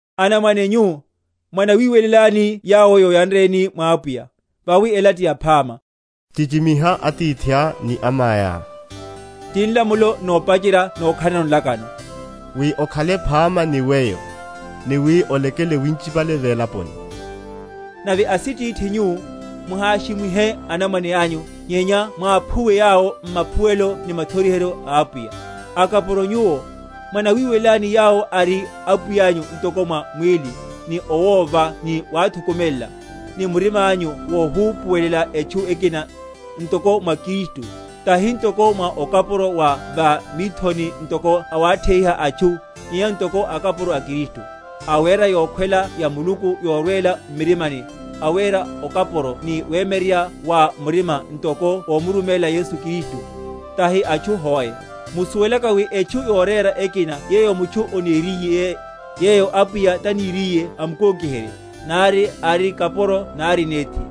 Anamwane nyu, mwanawiweleláni yawo yoyanreni mwa Apwiya, vawi ela tiyaphama. Chichimiha atithiá ni amaiá (ti nlamulo nopacherya nokhalano nlakano), wi okhale phama ni weyo, ni wi olekele winchipale velaponi. Nave asitithi nyuwo, muhashimwihe anamwane anyu; nyenya mwaphuwe yawo m’maphuwelo ni mathoriheryo a Apwiya. Akapuro nyuwo, mwanawiweleláni yawo ari apwiyányu ntoko mwa mwíli, ni owova ni wathukumelela, ni murimányu wohupuwelela etchu ekina, ntoko mwa Kristu; tahi ntoko mwa okapuro wa va mithoni, ntoko awatheiha atchu, nyenya ntoko akapuro a Kristu, awera yokhwela ya Muluku yorwela m’murimani; awera okapuro ni wemyeryerya wa murima, ntoko omuruméla Yesu Kristu, tahi atchu hoe; musuwelaka wi etchu yorera ekina yeyo mutchu oneriye, yeyo Apwiya taniriye amkokiherye, nari ari kapuro nari nethi.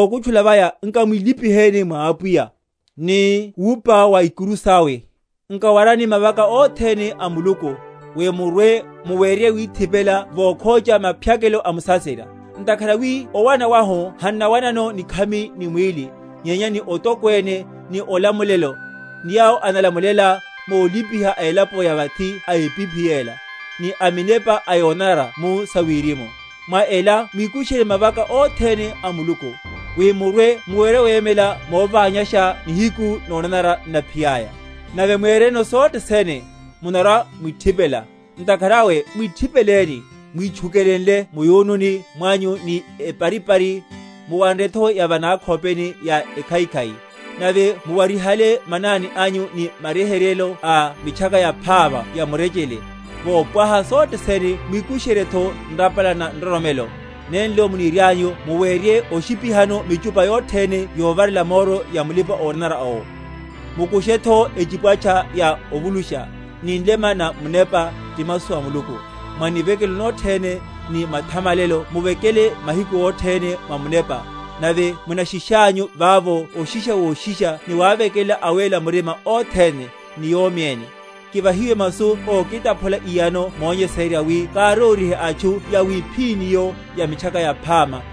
Vokutchula vaya, nkamwilipihéni mwa Apwiya, ni wupa wa ikuru sawe. Nkawarani mavaka othene a Muluku, wi murwe‐muwerye withipela vokhocha maphyakelo a musaserya. Ntakhara wi owana wahu hannawanano nikhami ni mwíli, nyenya ni otokwene, ni olamulelo, ni yawo analamulela molipiha a elapo ya vathi a epiphi yela, ni aminepa a yonanara mu sawirimu. Mwa ela mwikusherye mavaka othene a Muluku, wi murwe‐muwerye wemela moványasha nihiku nonanara n’naphiyaya, nave, mwéreno sothe sene, munarwa‐mwithipela. Ntakhara awe mwithipeleni, mwitchukelenle mu’yununi mwanyu ni eparipari, muwanretho ya va nakhopeni ya ekhaikhai; nave muwarihale manani anyu ni maryeheryelo a Mitchaka Yaphama ya murechele; vopwaha sothe sene mwikushenryetho nrapala na nroromelo, nenlo munirianyu muwerye oshipihano michupa yothene yovarela moro ya mulipa‐onanara owo. Mukushetho echipwatcha ya ovulusha, ni nlema na Munepa, ti masu a Muluku; mwa nivekelo nothene ni mathamalelo muvekele mahiku othene mwa Munepa, nave munashishanyu vavo oshisha woshisha ni wavekelela awéla murima othene, ni yomi ene, kivahiwe masu ókitaphula iyano monyesererya, wi kárórihe atchu yawiphíní’yo ya Mitchaka Yaphama,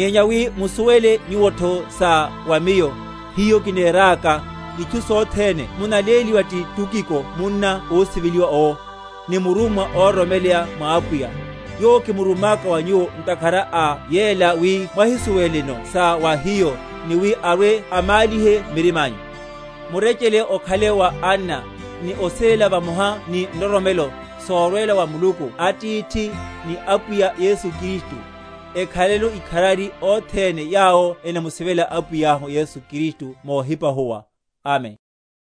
Nyenya wi musuwele nyuwotho sa wa miyo, hiho kineraka, itchu sothene munaléliwa ti Tukiko munna ósiveliwa owo, ni murummwa óroromeleya mwa Apwiya; yowo kimurummaka wa nyuwo ntakhara a yela, wi mwahisuweleno sa wa hiyo, ni wi arwe‐amálihe mirimányu. Murechele okhale wa anna, ni osivela, vamoha ni nroromelo, sorwela wa Muluku Atithi, ni Apwiya Yesu Kristu. Ekhaleno ikharari othene yawo enamusivela Apwiyahu Yesu Kristu mohipahuwa. Amen.